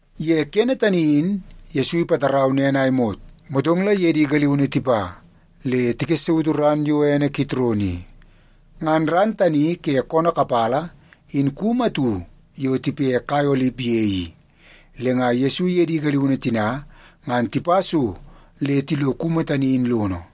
Ye kene tani in Yesu ipatarau nen a imot, motong la iye di galiunu tipa le tikessautu ran yo ene Kitron i. Ngan ran tani ke koonoo kapala in kumu atu yo tipe kai olip ye i, le nga Yesu iye di galiunu tina ngan tipa so le tilo kumu tani in lono.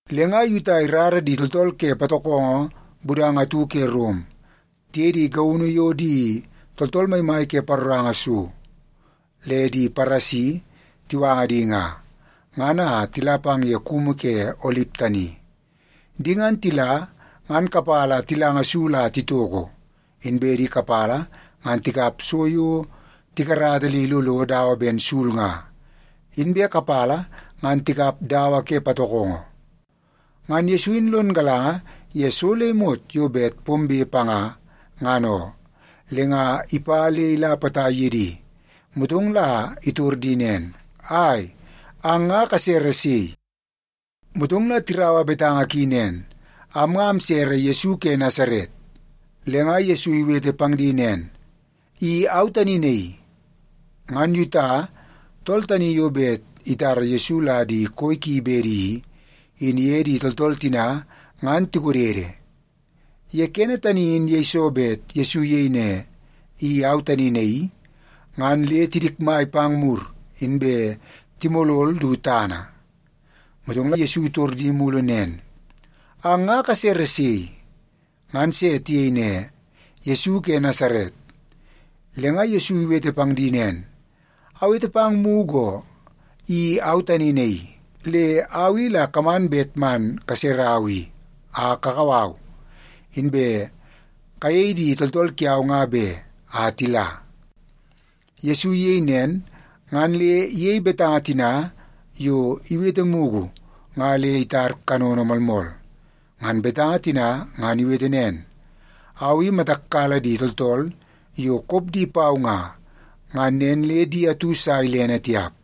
Le nga Yuta irara di tooltool ke patokongo budanga atu ke Rom tiye di gaunu yo di tooltool maimai ke paroranga so le di Paresi tiwanga di nga, ngan a tila pang ye kumu ke olip tani. Di ngan tila ngan kapala tilanga sul a titoko, inbe di kapala ngan tikap so yo tikarata le ilolo dawa ben sul nga, inbe kapala ngan tikap dawa ke patokongo. Ngan Yesu in lon galanga ye so le imot yo bet pombe panga, ngan oo. Le nga ipa le ila potai ye di, motong la itor di nen, “Ai, ang nga kasere sei?” Motong la tiraua betanga ki nen, “Am nga amsere Yesu ke Nasaret.” Le nga Yesu iwete pang di nen, “I au tani naii.” Ngan Yuta, tool tani yo bet itara Yesu la di koi ki bedi i, in iye di tooltool tina ngan tikodede. Ye kene tani in yeiso bet Yesu iyei ne, “I au tani naii,” ngan le tidikmai pang mur inbe timolol du tana. Motong la Yesu itor di mulu nen, “Ang nga kasere sei?” Ngan se tiyei ne, “Yesu ke Nasaret.” Le nga Yesu iwete pang di nen, “Awete pang mugu oo, i au tani naii. Le au i la kaman bet man kaserau i, a kakau au, inbe kayei di tooltool kiau nga be, a tila.” Yesu iyei nen, ngan le iyei betanga tina yo iwete mugu nga le itar kanono moolmool. Ngan betanga tina ngan iwete nen, “Au i matak kala di tooltool yo kop di pau nga, ngan nen le di atu sa ilene tiap.”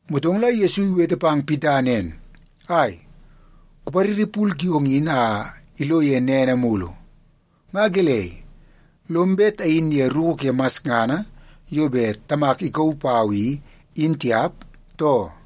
Motong la Yesu iwete pang Pita nen, “Ai, kupariri pul kiong in a ilo ye nene mulu! Nga gelei, lom bet ayin ye ruku ke masngana yo bet Tamak ikauu pau i, in tiap, too?”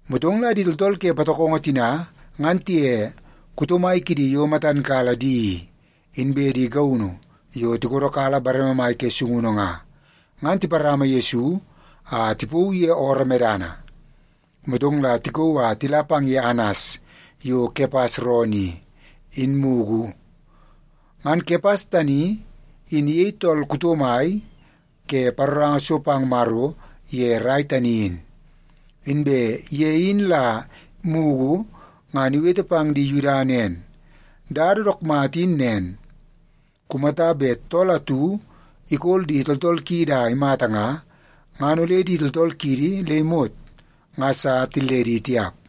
Motong la di tooltool ke patokongo tina ngan tiye kuto mai kidi yo matan kala di i, inbe di gaunu yo tikodokala bareme mai ke sungunu nga, ngan tiparama Yesu a tipauu ye ooroo medana. Motong la tikauu a tila pang ye Anas yo Kepas roonoo i, in mugu. Ngan Kepas tani, in iyei tool kuto mai ke paroranga so pang Maro ye rai tani in. Inbe ye in la mugu ngan iwete pang di Yuda nen, “Dada dook mata in nen: Kumata bet tool atu ikol di tooltool kiidi a imata nga, ngan ole di tooltool kiidi le imot nga sa tilledi tiap.”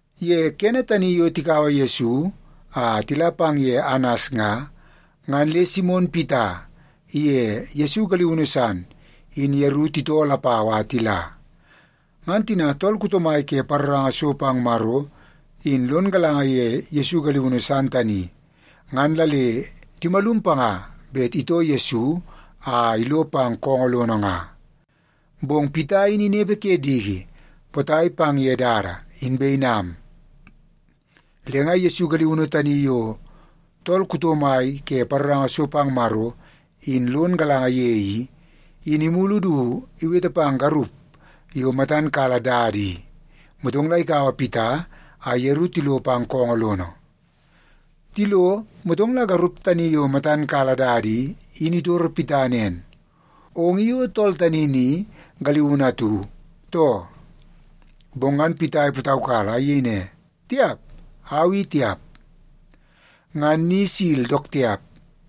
Ye kene tani yo tikaua Yesu a tila pang ye Anas nga, ngan le Simon Pita iye Yesu galiunu san, in yeru titoo lapau a tila. Ngan tina tool kuto mai ke paroranga so pang Maro, in lon galanga ye Yesu galiunu san tani, ngan la le timalum panga bet itoo Yesu a ilo pang koongoo lono nga. Bong Pita in inepe ke diki potai pang ye dada, inbe inam. Le nga Yesu galiunu tani yo tool kuto mai ke paroranga so pang Maro, in lon galanga ye i, in imulu du iwete pang garup yo matan kala dada i, motong la ikaua Pita a yeru tilo pang koongoo lono. Tilo, motong la garup tani yo matan kala dada i, in itoro Pita nen, “Ong i o tool tani ni galiunu atu, too?” Bong ngan Pita ipataukala a iyei ne, “Tiap! Au i tiap.” Ngan ni sil dook tiap,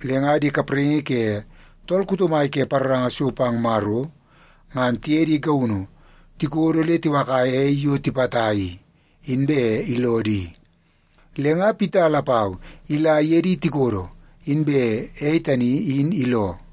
le nga di kapraingi ke tool kuto mai ke paroranga so pang Maro, ngan tiye di gaunu tikodo le tiwakaia ei yo tipata i, inbe iloo di. Le nga Pita lapau ila iye di tikodo, inbe ei tani in iloo.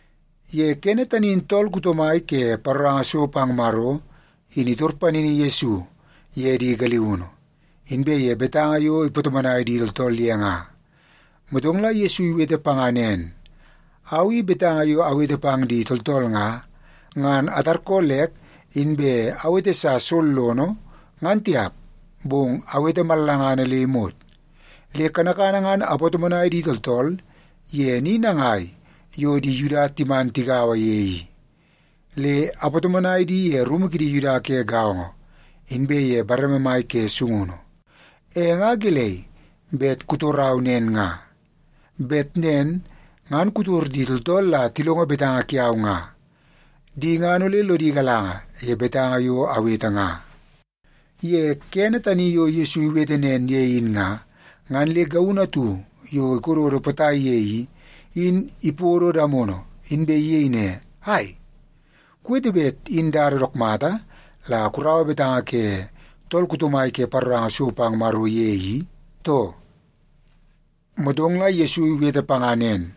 Ye kene tani in tool kuto mai ke paroranga so pang Maro, in itor panini Yesu ye di galiunu, inbe ye betanga yo ipatomonai di tooltool ye nga. Motong la Yesu iwete panga nen, “Au i betanga yo awete pang di tooltool nga, ngan atarkoolek inbe awete sa sollono, ngan tiap, bong awete mallangana le imot. Le kanakana ngan apatomonai di tooltool ye ni nangai yo di Yuda timan tigaua ye i. Le apatomonai di ye rumu kidi Yuda ke gaongo, inbe ye bareme mai ke sungunu. E nga gelei bet kutorau nen nga? Bet nen ngan kutor di tooltool la tilongo betanga kiau nga. Di ngan ole lodi galanga ye betanga yo awete nga.” Ye kene tani yo Yesu iwete nen ye in nga, ngan le gaunu atu yo ikododo potai ye i, in ipodo damono, inbe iyei ne, “Ai, kuwete bet in dada dook mata la kuraua betanga ke tool kuto mai ke paroranga so pang Maro ye i, too?” Motong la Yesu iwete panga nen,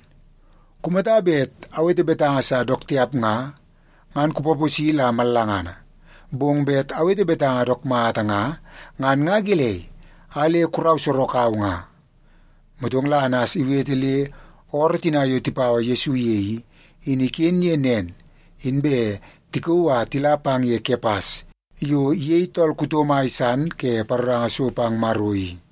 “Kumata bet awete betanga sa dook tiap nga, ngan kupaposi la mallangana. Bong bet awete betanga dook mata nga, ngan nga gelei a le kurau sorok au nga?” Motong la Anas iwete le ooroo tina yo tipaua Yesu ye i, in iken ye nen, inbe tikauu a tila pang ye Kepas yo iyei tool kuto mai san ke paroranga so pang Maro i.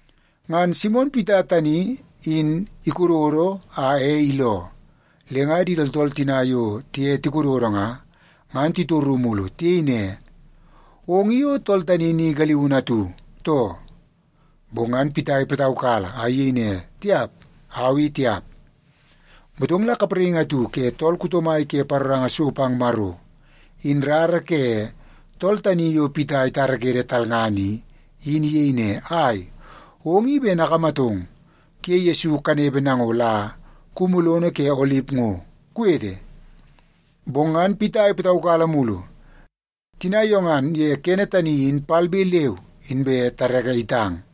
Ngan Simon Pita tani in ikododo a ei iloo. Le nga di tooltool tina yo tiye tikododo nga, ngan titoru mulu. Tiyei ne, “Ong i o tool tani ni galiunu atu, too?” Bong ngan Pita ipataukala a iyei ne, “Tiap! Au i tiap.” Motong la kapraingi atu ke tool kuto mai ke paroranga so pang Maro, in rara ke tool tani yo Pita itarakede talngana i, in iyei ne, “Ai, ong i ben akamatong kuye Yesu kanepe nango la kumu lono ke olip ngo, kuwete?” Bong ngan Pita ipataukala mulu. Tina yo ngan ye kene tani in palbe leu inbe tareke itang.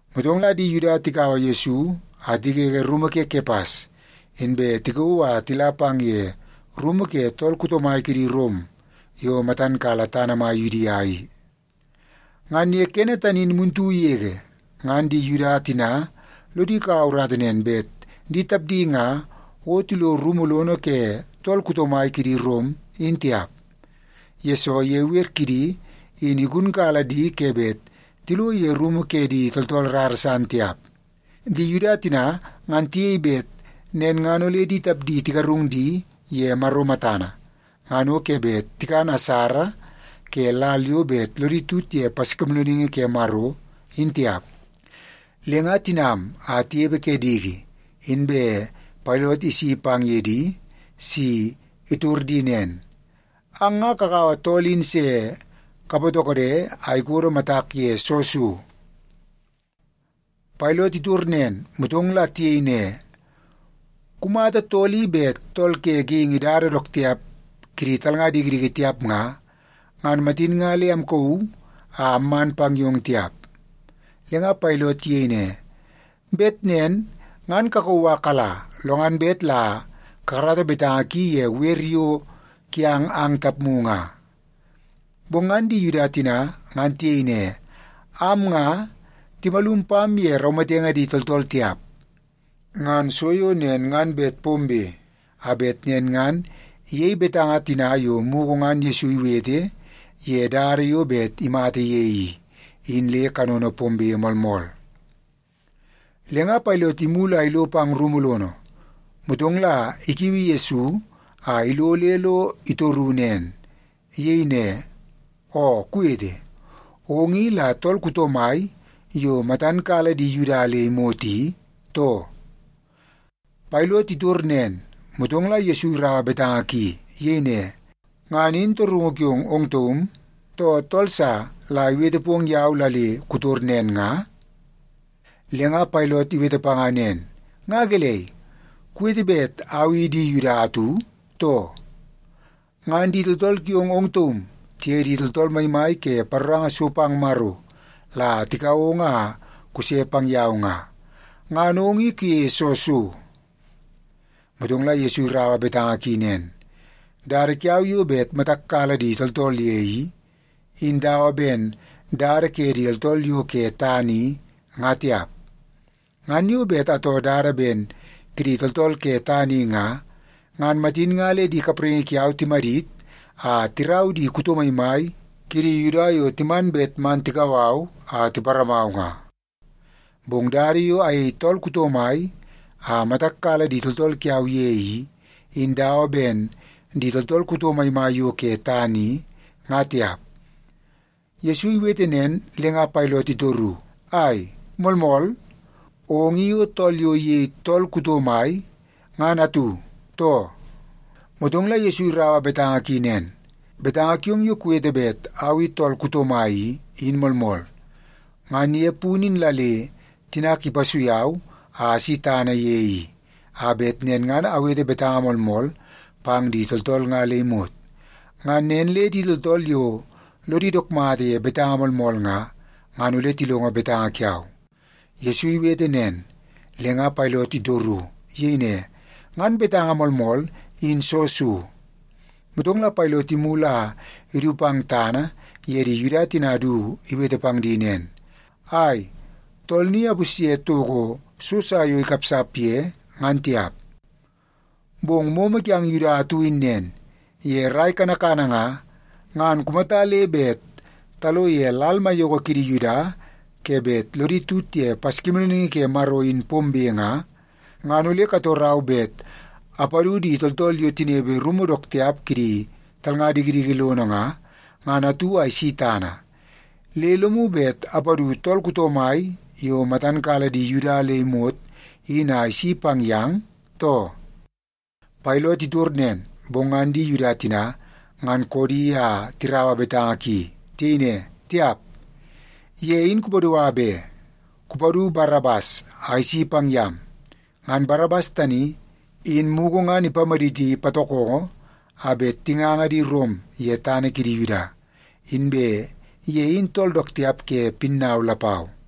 Motong la di Yuda tikaua Yesu a tigege rumu ke Kepas, inbe tikauu a tila pang ye rumu ke tool kuto mai kidi Rom yo matan kala tana mai Yudia i. Ngan ye kene tani in muntu yege, ngan di Yuda tina lodi kaua urata nen bet di tapdi nga o tilo rumu lono ke tool kuto mai kidi Rom, in tiap. Yesoo, ye wer kidi in igunkala di ke bet tilo ye rumu ke di tooltool rara san tiap. Di Yuda tina ngan tiyei bet nen ngan ole di tapdi tigarung di ye Maro matana ngan o ke bet tikan asara ke lal yo bet lodi tut ye Paskimoolooningi Ke Maro, in tiap. Le nga tinam a tinepe ke diki, inbe Pailot isi pang ye di si itor di nen, “Ang nga kakaua tool in se kapatokode a ikodo matak ye soo so?” Pailot itor nen, motong la tiyei ne, “Kumata tool i bet tool ke geingi dada dook tiap kidi talnga dikidiki tiap nga, ngan matin nga le amkauu a amman pang yong tiap.” Le nga Pailot iyei ne, “Bet nen ngan kakauu a kala, lo ngan bet la kakarata betanga ki ye wer yo kiang ang tapmu nga.” Bong ngan di Yuda tina ngan tiyei ne, “Am nga, timalum pam ye raumatenge di tooltool tiap.” Ngan so yo nen ngan bet pombe, a bet nen ngan iyei betanga tina yo mugu ngan Yesu iwete ye dada yo bet imata ye i, in le kanono pombe moolmool. Le nga Pailot imulu a ilo pang rumu lono, motong la ikiui Yesu a ilo le lo itoru nen. Iyei ne, “Oo kuwete, ong i la tool kuto mai yo matam kala di Yuda le imot i, too?” Pailot itor nen, motong la Yesu iraua betanga ki. Iyei ne, “Ngan in torungu kiong ong taum, too tool sa la iwete pong yau la le kutor nen nga?” Le nga Pailot iwete panga nen, “Nga gelei, kuwete bet au i di Yuda atu, too? Ngan di tooltool kiong ong taum, tiye di tooltool maimai ke paroranga so pang Maro la tikau ong a kuse pang yau nga. Ngan ong i kuyeie soo so?” Motong la Yesu iraua betanga ki nen, “Dada kiau yo bet matak kala di tooltool ye i, in dawa ben dada ke di tooltool yo ke tana i, nga tiap. Ngan yo bet atoo dada ben kidi tooltool ke tana i nga, ngan matin nga le di kapraingi kiau timadit a tirau di kuto maimai kidi Yuda yo timan bet man tikau au a tiparamau nga. Bong dada yo ayei tool kuto mai a matak kala di tooltool kiau ye i, in dawa ben di tooltool kuto maimai yo ke tana i, nga tiap.” Yesu iwete nen le nga Pailot itoru, “Ai, moolmool! Ong i o tool yo iyei tool kuto mai, ngan atu, too?” Motong la Yesu iraua betanga ki nen, “Betanga kiong yo kuwete bet au i tool kuto mai i, in moolmool. Ngan ye punu in la le tinak ipasui au a asi tana ye i, a bet nen ngan awete betanga moolmool pang di tooltool nga le imot. Ngan nen le di tooltool yo lodi dook mata ye betanga moolmool nga, ngan ole tilongo betanga kiau.” Yesu iwete nen, le nga Pailot itoru. Iyei ne, “Ngan betanga moolmool, in soo so?” Motong la Pailot imulu a idu pang tana ye di Yuda tina du iwete pang di nen, “Ai, tool ni apusye toko so sa yo ikapsap ye, ngan tiap. Bong momo kiang Yuda atu in nen: Ye rai kanakana nga, ngan kumata le bet talo ye lal maiyoko kidi Yuda ke bet lodi tut ye Paskimoolooningi Ke Maro in pombe nga, ngan ole katorau bet apadu di tooltool yo tinepe rumu dook tiap kidi talnga dikidiki lono nga, ngan atu a isi tana. Le lomu bet apadu tool kuto mai yo matan kala di Yuda le imot in a isi pang yang, too?” Pailot itor nen, bong ngan di Yuda tina ngan koodi a tiraua betanga ki. Tiyei ne, “Tiap, ye in kupadua be! Kupadu Barabas a isi pang yam!” Ngan Barabas tani, in mugu ngan ipamaditi patokongo a bet tinganga di Rom ye tana kidi Yuda, inbe ye in tool dook tiap ke pinnau lapau.